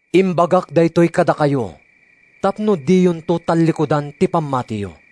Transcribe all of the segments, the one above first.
“Imbagak daytoy kadakayo tapno diyonto tallikudan ti pammatiyo.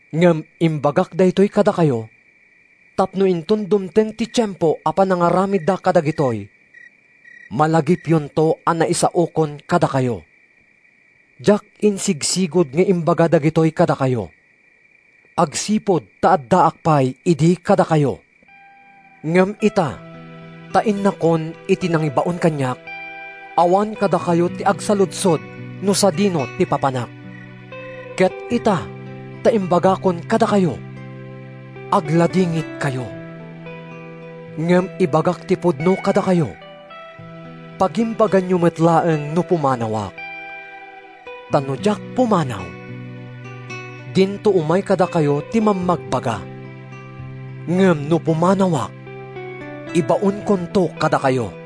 Ngem imbagak daytoy kadakayo tapno inton dumteng ti tiempo a panangaramidda kadagitoy, malagipyonto a naisaokon kadakayo.” “Diak insigsigud nga imbaga dagitoy kadakayo, agsipud ta addaak pay idi kadakayo. Ngem ita ta innakon iti nangibaon kaniak, awan kadakayo ti agsaludsod no sadino ti papanak. Ket ita ta imbagakon kadakayo, agladingitkayo. Ngem ibagak ti pudno kadakayo: Pagimbaganyo met laeng no pumanawak, ta no diak pumanaw, dinto umay kadakayo ti Mammagbaga. Ngem no pumanawak, ibaonkonto kadakayo.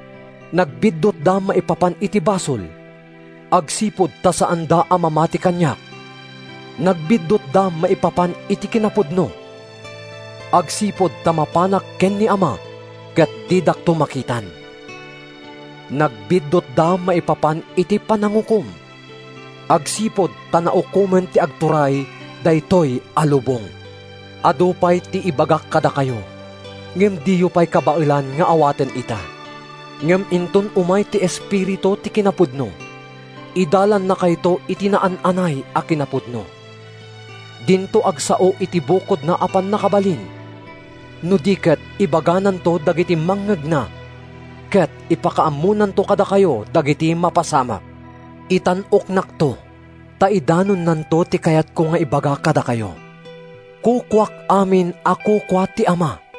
Nagbiddutda maipapan iti basol, agsipud ta saanda a mamati kaniak. Nagbiddutda maipapan iti kinapudno, agsipud ta mapanak ken ni Ama ket didakto makitan. Nagbiddutda maipapan iti panangukom, agsipud ta naukomen ti agturay daytoy a lubong. “Adu pay ti ibagak kadakayo, ngem diyo pay kabaelan nga awaten ita. Ngem inton umay ti Espiritu ti kinapudno, idalannakayto iti naan-anay a kinapudno. Dinto agsao iti bukodna a pannakabalin no di ket ibagananto dagiti mangngegna, ket ipakaammonanto kadakayo dagiti mapasamak. Itan-oknakto, ta idanonnanto ti kayatko nga ibaga kadakayo. Kukuak amin a kukua ti Ama.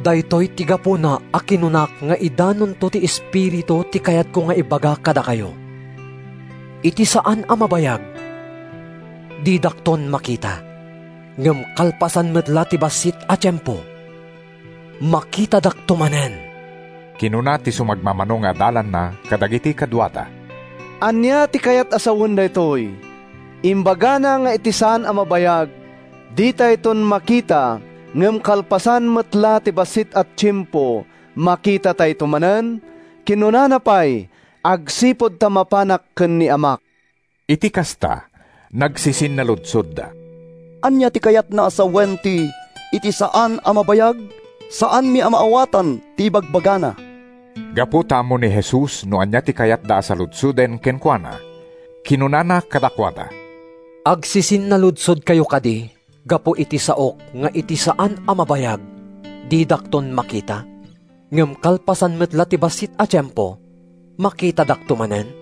Daytoy ti gapuna a kinunak nga idanonto ti Espiritu ti kayatko nga ibaga kadakayo.” “Iti saan a mabayag, didakton makita. Ngem kalpasan met la ti bassit a tiempo, makitadakto manen.” Kinuna ti sumagmamano nga adalanna kadagiti kaduada, “Ania ti kayat a sawen daytoy? Imbagana nga iti saan a mabayag, ditayton makita, ngem kalpasan met la ti bassit a tiempo, makitatayto manen? Kinunana pay, ‘Agsipud ta mapanak ken ni Amak.’” Iti kasta, nagsisinnaludsodda, “Ania ti kayatna a sawen ti ‘iti saan a mabayag’? Saanmi a maawatan ti ibagbagana!” Gapu ta ammo ni Jesus no ania ti kayatda a saludsoden kenkuana, kinunana kadakuada, “Agsisinnaludsodkayo kadi gapu iti saok nga ‘Iti saan a mabayag, didakton makita, ngem kalpasan met la ti bassit a tiempo, makitadakto manen’?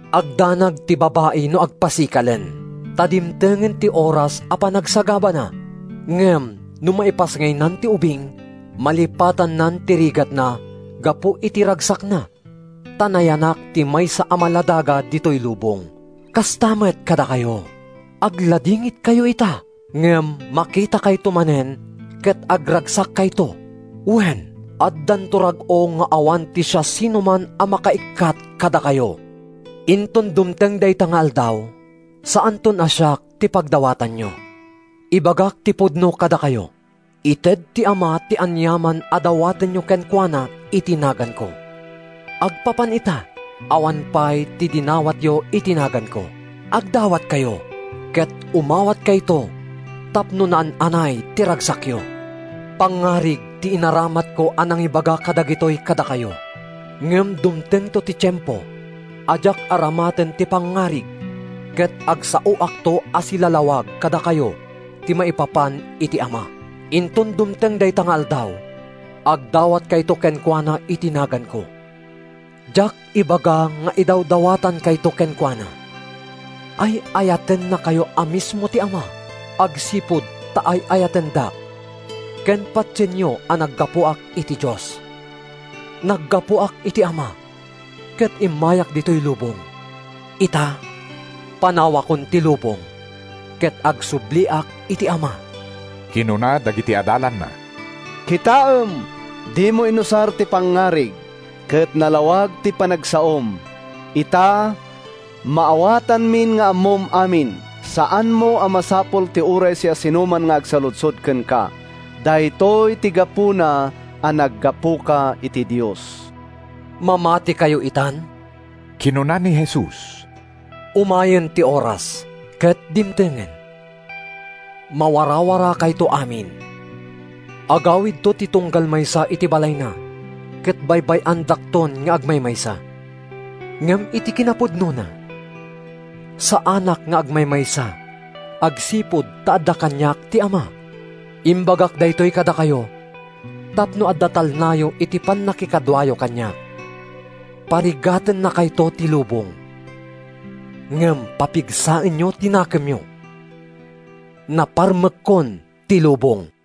Agdanag ti babai no agpasikalen, ta dimtengen ti oras a panagsagabana, ngem no maipasngaynan ti ubing, malipatannan ti rigatna gapu iti ragsakna ta nayanak ti maysa a maladaga ditoy lubong. Kasta met kadakayo: Agladingitkayo ita, ngem makitakayto manen ket agragsakkayto. Wen, addanto rag-o nga awan ti siasinoman a makaikkat kadakayo. “Inton dumteng dayta nga aldaw, saanton a siak ti pagdawatanyo. Ibagak ti pudno kadakayo: Ited ti Ama ti aniaman a dawatenyo kenkuana iti naganko. Agpapan ita, awan pay ti dinawatyo iti naganko. Agdawatkayo ket umawatkayto tapno naan-anay ti ragsakyo.” “Pangngarig ti inaramatko a nangibaga kadagitoy kadakayo. Ngem dumtengto ti tiempo a diak aramaten ti pangngarig ket agsaoakto a silalawag kadakayo ti maipapan iti Ama. Inton dumteng dayta nga aldaw, agdawatkayto kenkuana iti naganko. Diak ibaga nga idawdawatankayto kenkuana. Ay-ayatennakayo a mismo ti Ama, agsipud ta ay-ayatendak ken patienyo a naggapuak iti Dios. Naggapuak iti Ama ket immayak ditoy lubong. Ita, panawakon ti lubong ket agsubliak iti Ama.” Kinuna dagiti adalanna, “Kitaem, dimo inusar ti pangngarig, ket nalawag ti panagsaom. Ita, maawatanmin nga ammom amin. Saanmo a masapul ti uray siasinoman nga agsaludsod kenka. Daytoy ti gapuna a naggapuka iti Dios.” “Mamatikayo itan?” kinuna ni Jesus. “Umayen ti oras, ket dimtengen. Mawarawarakayto amin. Agawidto ti tunggal maysa iti balayna ket baybay-andakton nga agmaymaysa. Ngem iti kinapudnona, saanak nga agmaymaysa agsipud ta adda kaniak ti Ama. Imbagak daytoy kadakayo tapno adda talnayo iti pannakikaduayo kaniak. Parigatennakayto ti lubong. Ngem papigsaenyo ti nakemyo! Naparmekkon ti lubong!”